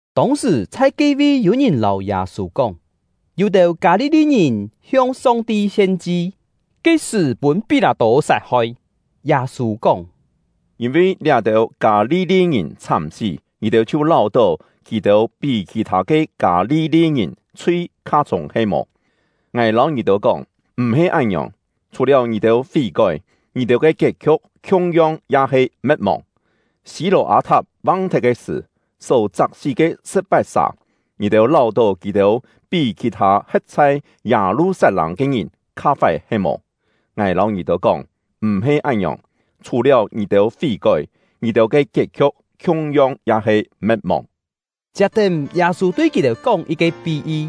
Tông-sṳ̀, chhai ke-vi yû-ngìn lâu Yâ-sû kóng, yû-têu Kâ-li-li-ngìn hiong Song-ti hien-chi ke sṳ̀ pûn Pí-lâ-tô sat-hoi. Yâ-sû kóng: “Yîn-vi liá-têu Kâ-li-li-ngìn chhám-sí, ngì-têu chhiu láu-tó kì-têu pí khì-thâ ke Kâ-li-li-ngìn chhui kha chhûng he-mò? Ngài lâu ngì-têu kóng, m̀-he án-ngiòng; chhù-liáu ngì-têu fí-kói, ngì-têu ke kiet-khiu̍k khiung-yong ya he me̍t-mòng. Sî-lò-â-thap vang-thet ke sṳ̀, só chak-sí ke sṳ̍p-pat-sà, ngì-têu láu-tó kì-têu pí khì-thâ he̍t chhai Yâ-lu-sat-lâng ke ngìn kha fái he-mò? Ngài lâu ngì-têu kóng, m̀-he án-ngiòng; chhù-liáu ngì-têu fí-kói, ngì-têu ke kiet-khiu̍k khiung-yong ya he me̍t-mòng.” Chiap-tén, Yâ-sû tui kì-têu kóng yit-ke pí-yi: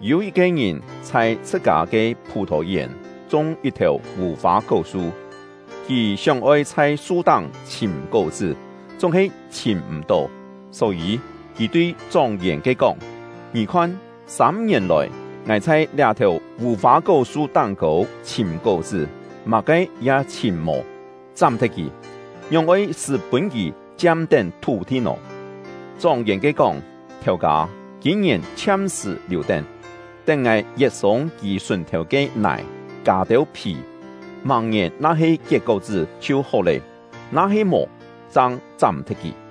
“Yû yit-ke ngìn chhai chhṳ-kâ ke phù-thò-yèn chung yit-thèu vù-fâ-kó-su. Kì sióng-oi chhai su-táng chhìm kó-chṳ́, chúng-he chhìm m̀-tó. Só-yî, kì tui chóng-yèn-ke kóng: ‘Ngì khon, sâm-ngièn lòi, ngài chhai liá-thèu vù-fâ-kó-su táng-kô chhìm kó-chṳ́, má-ke ya chhìm mò. Chám-thet kì! Ngióng oi-sṳ́ pûn kì chiam-tén thú-thi nò?’ Chóng-yèn-ke kóng: ‘Thèu-kâ, kîm-ngièn chhiam-sṳ̀ liù-tén, tén ngài yet-sûng kì sùn-thèu ke nài, kâ têu phì. Màng-ngièn na-he kiet kó-chṳ́ chhiu hó lé; na-he mò, chang chám-thet kì.’”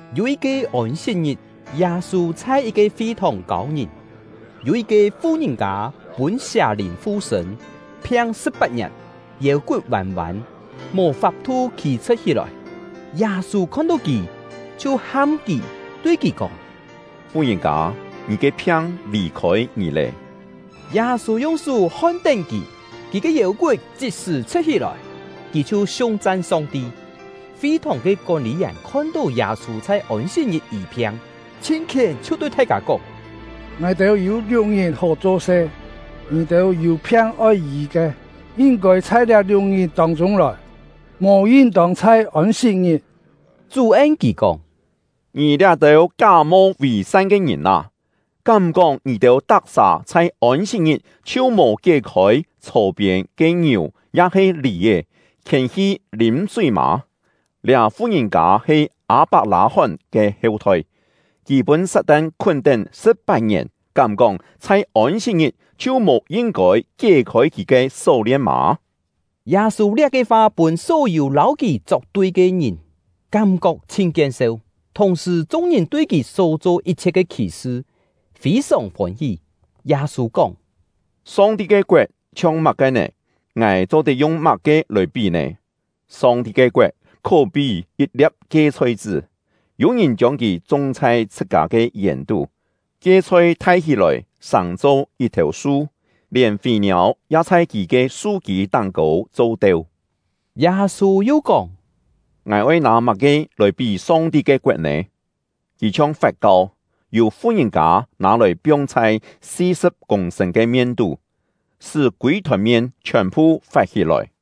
Yû yit-ke Ôn-sit-ngit, Yâ-sû chhai yit-ke fi-thòng kâu ngìn. Yû yit-ke fu-ngìn-kâ pûn sià-lìn fu-sṳ̂n, phiang sṳ̍p-pat-ngièn, yêu-kut vân-vân, mò fap-thu khî-chhṳ̍t hí-lòi. Yâ-sû khon-tó kì, chhiu ham kì, tui kì kóng: “Fu-ngìn-kâ, ngì ke phiang lì-khôi ngì lé!” Yâ-sû yung sú hon-tén kì, kì ke yêu-kut chit-sṳ̀ chhṳ̍t-hí-lòi; kì chhiu siung-chan Song-ti. Fi-thòng ke kón-lî-yèn khon-tó Yâ-sû chhai Ôn-sit-ngit yî-phiang, chhin khién, chhiu tui thai-kâ kóng: “Ngài-têu yû liuk-ngit hó cho-se; ngì-têu yû phiang oi yî ke, yin-kôi chhai liá liuk-ngit tông-chûng lòi, mò yin-tông chhai Ôn-sit-ngit!” Chú en kì kóng: “Ngì liá-têu ká-mo vì-san ke ngìn â! Kám-kóng ngì-têu tak-sà chhai Ôn-sit-ngit chhiu mò kié-khôi chhò-piên ke ngiù ya-he lì-è, khiên-hi lîm-súi mâ? Liá fu-ngìn-kâ he Â-pak-lâ-hón ke heu-thoi, kì pûn Sat-tan khún-tén sṳ̍p-pat-ngièn; kám-kóng chhai Ôn-sit-ngit chhiu mò yin-kôi kié-khôi kì ke só-lien mâ?” Yâ-sû liá-ke fa pûn só-yû lâu kì chok-tui ke ngìn kám-kok chhin kien-seu; thùng-sṳ̀, chung-ngìn tui kì só-cho yit-chhiet ke khì-sṳ fî-sòng fôn-hí. Yâ-sû kóng: “Song-ti ke koet chhiong má-ke nè? Ngài cho-tet yung má-ke lòi pí nè? Song-ti ke koet khó-pí yit-lia̍p kie-chhoi-chṳ́, yû-ngìn chiông kì chung chhai chhṳ-kâ ke yèn-tú. Kie-chhoi thai hí-lòi, sàng-cho yit-thèu su, lièn fî-niâu ya chhai kì ke su-kî táng-kô cho-teu.” Yâ-sû yu kóng: “Ngài oi nâ má-ke lòi pí Song-ti ke koet nè? Kì chhiong fat-kau, yû fu-ngìn-kâ nâ-lòi piong chhai si-sṳ̍p kûng-sṳ̂n ke mien-tú, sṳ́ kûi-thòn mien chhiòn-phu fat-hí-lòi.”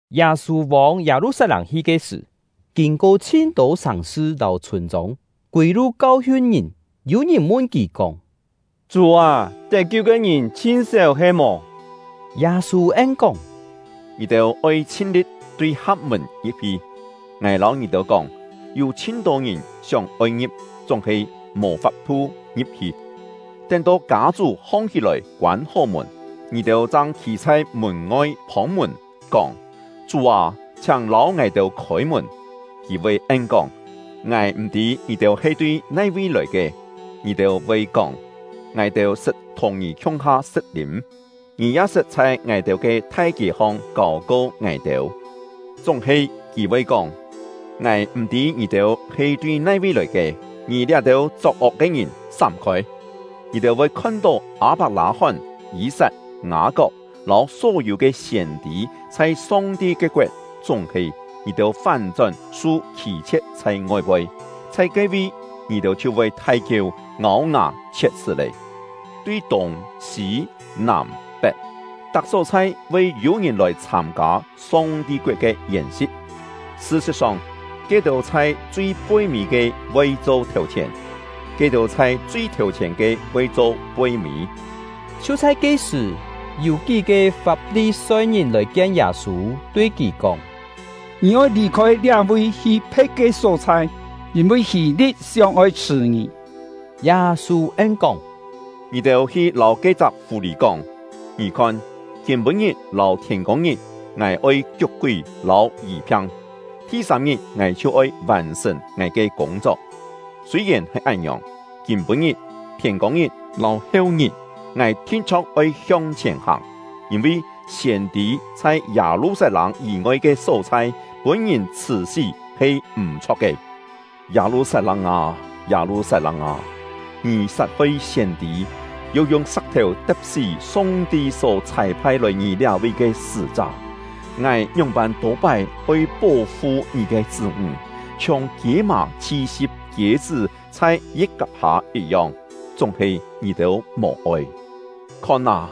Yâ-sû vông Yâ-lu-sat-lâng hi ke sṳ̀, kîn-ko chhin-tô sàng-sṳ lâu chhûn-chông, kûi-lu kau-hiun ngìn. Yû ngìn mun kì kóng: “Chú â, tet-kiu ke ngìn chhin séu he-mò?” Yâ-sû en-kóng: “Ngì-têu oi chhin-li̍t tui ha̍p-mùn ngi̍p-hi. Ngài lâu ngì-têu kóng, yû chhin-tô ngìn sióng-oi ngi̍p, chúng-he mò fap-thu ngi̍p-hi. Tén-to kâ-chú hong-hí-lòi koân-hó mùn, ngì-têu chang khî chhai mùn-ngoi phông-mùn, kóng: ‘Chú â, chhiáng lâu ngài-têu khôi-mùn!’ Kì voi en-kóng: ‘Ngài m̀-tî ngì-têu he tui nai-vi lòi ke!’ Ngì-têu voi kóng: ‘Ngài-têu sṳt thùng ngì khiung-ha sṳ̍t-lîm; ngì ya sṳt chhai ngài-têu ke thai kiê-hong kâu-ko ngài-têu.’ Chúng-he, kì voi kóng: ‘Ngài m̀-tî ngì-têu he tui nai-vi lòi ke. Ngì liá-têu chok-ok ke ngìn, sám-khôi!’ Ngì-têu voi khon-tó Â-pak-lâ-hón, Yî-sat, Ngâ-kok, lâu só-yû ke siên-tî chhai Song-ti ke koet, chúng-he ngì-têu fán-chón su khî-chhie̍t chhai ngoi-poi; chhai ke-vi, ngì-têu chhiu voi thai-kieu, ngâu-ngà chhiet-chhṳ́ lé! Tui tûng, sî, nàm, pet, tak só-chhai voi yû ngìn lòi chhâm-kâ Song-ti koet ke yèn-si̍t. Sṳ-sṳ̍t-song, ke-têu chhai chui poi-mî ke voi cho thèu-chhièn; ke-têu chhai chui thèu-chhièn ke voi cho poi-mî.” Chhiu chhai ke-sṳ̀, yû kí-ke Fap-li-soi-ngìn lòi kien Yâ-sû, tui kì kóng: “Ngì oi lì-khôi liá-vi hi phe̍t ke só-chhai, yîn-vi Hî-li̍t sióng-oi chhṳ̀ ngì.” Yâ-sû en-kóng: “Ngì-têu hi lâu ke-chak fù-lì kóng: ‘Ngì khon! Kîm-pû-ngit lâu thiên-kông-ngit ngài oi kiuk-kúi lâu yî-phiang, thi-sâm-ngit ngài chhiu oi vàn-sṳ̀n ngài ke kûng-chok.’ Sûi-yèn he án-ngiòng, kîm-pû-ngit, thiên-kông-ngit, lâu hêu-ngit, ngài thin-chho̍k oi hiong-chhièn hàng, yîn-vi siên-tî chhai Yâ-lu-sat-lâng yî-ngoi ke só-chhai pûn-ngìn chhṳ̀-sí he m̀-chho̍k ke. “Yâ-lu-sat-lâng â! Yâ-lu-sat-lâng â! Ngì sat-hoi siên-tî, yu yung sa̍k-thèu te̍p-sí Song-ti só chhâi-phai lòi ngì liá-vi ke sṳ́-chá! Ngài ngióng-pân tô-pái oi pó-fu ngì ke chṳ́-ńg, chhiong kiê-mà chhi-si̍p kiê-chṳ́ chhai yi̍t-kap hâ yit-yong; chúng-he ngì-têu mò-oi! Khon â,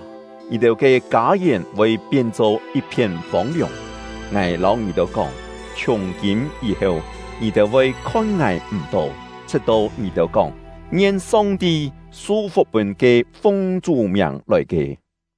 ngì-têu ke kâ-yèn voi pien-cho yit-phién fông-liòng. Ngài lâu ngì-têu kóng, chhiùng-kîm yî-heu, ngì-têu voi khon ngài m̀-tó, chhṳ̍t-to ngì-têu kóng: ‘Ngien Song-ti su-fuk pûn ke fung Chú miàng lòi ke!’”